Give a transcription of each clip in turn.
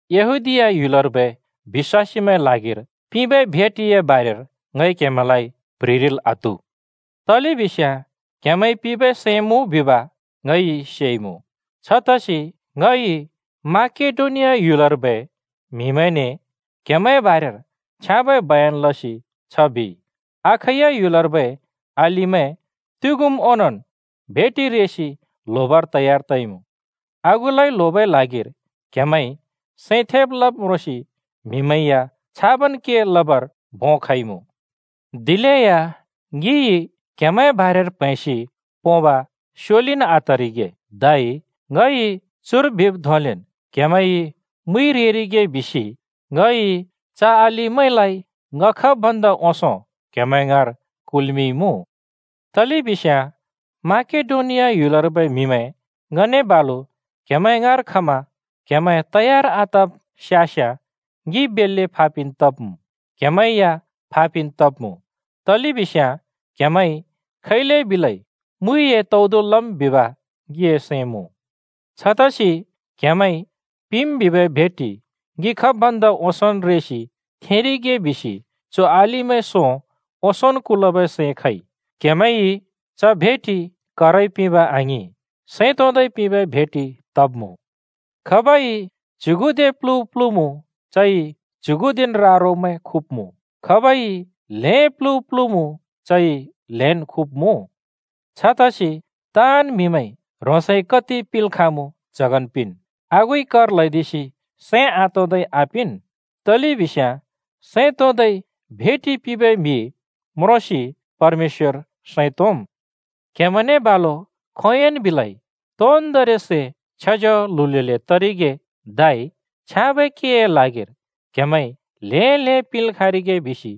यहूदीया ह्‍युलर्बै बिश्‍वासीमैंए ल्हागिर पिंबै भेटिए बारेर ङइ क्हेमैंलाइ प्‍ह्रिरिल् आत्हु। तलेबिस्याँ क्‍हेमैंइ पिंबै सैं मुँ बिब ङइ सेइमुँ। छतसि ङइ माकेडोनिया ह्‍युलर्बै म्‍हिमैंने क्‍हेमैंए बारेर छ्याँबै बयन लसि छ बिइ, “अखैया ह्‍युलर्बै अलिमैं तुग्‍युम् ओंनोंन् भेटि रेसि ल्होबर तयार तइमुँ।” आगुलाइ ल्होबै ल्हागिर क्‍हेमैंइ सैं थेब् लब् म्रोंसि म्‍हिमैं या छाबन् के लबर भों खइमुँ। दिलेया ङिइ क्‍हेमैंए बारेर प्हैंसि पोंब स्योलिन् आतरिगे, धै ङइ चुर बिब् धोंलेन् क्‍हेमैंइ मुइ रेरिगे बिसि ङइ च अलिमैंलाइ ङ खब् भन्दा ओंसों क्‍हेमैं ङाँर कुल्मिंइमुँ। तलेबिस्याँ माकेडोनियार्बै म्‍हिमैं ङने बालु क्हेमैं ङाँर खमा क्‍हेमैं तयार आतब् स्‍यास्‍याँ ङि बेल्‍ले फा पिन् तब्‍मुँ, क्‍हेमैं या फा पिन् तब्मुँ, तलेबिस्याँ क्‍हेमैंइ खैले बिलै मुइए तौदु लम् बिब ङिए सैं मुँ। छतसि क्हेमैंइ पिंम् बिबै भेटि ङि खब् भन्दा ओंसोंन् रेसि थेंरिगे बिसि चु अलिमैं सों ओंसोंन् कुलबै सैं खइ। क्‍हेमैंइ च भेटि करइ पिंब आङिं, सैं तोंदै पिंबै भेटि तब्मुँ। खाबइ च्‍युगुदे प्‍लु प्‍लुमुँ चइ च्‍युगुदेन् रा-रोमैं खुब्‍मुँ, खाबइ ल्हें प्‍लु प्‍लुमुँ चइ ल्‍हेन् खुब्‍मुँ। छतसि ताँन् म्हिमैंइ ह्रोंसइ कति पिंल् खाँमुँ च्हगन् पिंन्, आगुइ कर ल्हैदिसि सैं आतोंदै आपिंन्। तलेबिस्याँ सैं तोंदै भेटि पिंबै म्‍हि म्रोंसि परमेश्‍वर सैं तोंम्। क्हेमैंने बालु खोंयोंन् बिलै तोन्दोंरि सै छ्येज्याल्हुल्हुले तरिगे, धै छ्याँबै केए ल्हागिर क्हेमैंइ ल्हें ल्हें पिंल् खाँरिगे बिसि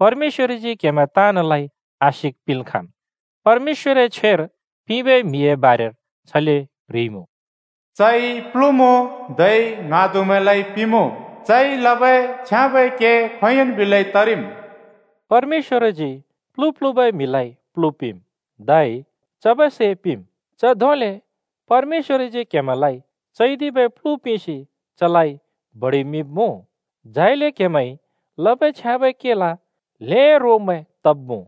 परमेश्‍वरजी क्‍हेमैं ताँनलाइ आशिक् पिंल् खाँम्। परमेश्‍वरए छ्वेर पिंबै म्‍हिए बारेर छले प्ह्रिइमुँ: “चइ प्लुमुँ, धै ङ्हाँदुमैंलाइ पिंमुँ, चइ लबै छ्याँबै के खोंयोंन् बिलै तरिम्।” परमेश्‍वरजी प्‍लु प्‍लुबै म्हिलाइ प्‍लु पिंम्, धै म्‍हिमैंलाइ चबै सै पिंम्। च धोंले परमेश्‍वरजी क्‍हेमैंलाइ चैदिबै प्‍लु पिंसि चलाइ बडिमिंब्‍मुँ, झाइले क्‍हेमैंइ लबै छ्याँबै केल ल्हें रोमैं तब्‍मुँ।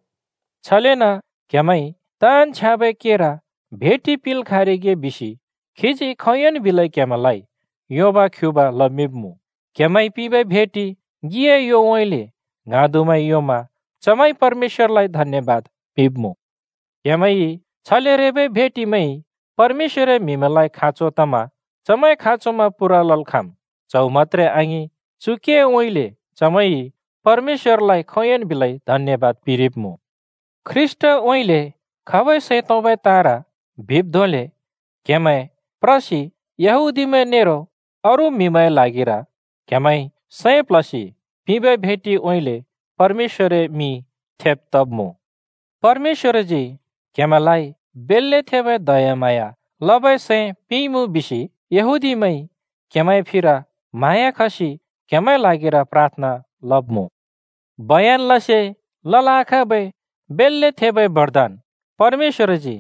छलेन क्‍हेमैंइ ताँन् छ्याँबै केर भेटि पिंल् खाँरिगे बिसि खीजी खोंयोंन् बिलै क्‍हेमैंलाइ योबा-ख्‍युबा लमिंब्‍मुँ। क्‍हेमैंइ पिंबै भेटि ङिए योउँइँले ङ्हाँदुमैंइ योंमा चमैंइ परमेश्‍वरलाइ धन्‍यबाद पिंब्‍मुँ। क्‍हेमैंइ छले रेबै भेटिमैंइ परमेश्‍वरए म्‍हिमैंलाइ खाँचो तमा चमैंए खाँचोमैं पूरा लल् खाँम्। च्हौ मत्‍त्रे आङिं, चु केउँइँले चमैंइ परमेश्‍वरलाइ खोंयोंन् बिलै धन्‍यबाद पिंरिब्‍मुँ। ख्रीष्‍टउँइँले खबै सैं तोंबै ताँर बिब् धोंले क्‍हेमैं प्रसि यहूदीमैं नेरो अरू म्हिमैंए ल्हागिर क्हेमैंइ सैं प्ल्हसि पिंबै भेटिउँइँले परमेश्‍वरए मिं थेब् तब्मुँ। परमेश्‍वरजी क्हेमैंलाइ बेल्‍ले थेबै दयाम्हाँया लबै सैं पिंइमुँ बिसि यहूदीमैंइ क्‍हेमैंए फिर म्हाँया खसि क्‍हेमैंए ल्हागिर प्राथना लब्‍मुँ। बयन लसे लल् आखाँबै बेल्‍ले थेबै बरदान परमेश्‍वरजी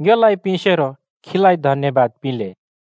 ङ्योलाइ पिंसेरो खीलाइ धन्‍यबाद पिंले।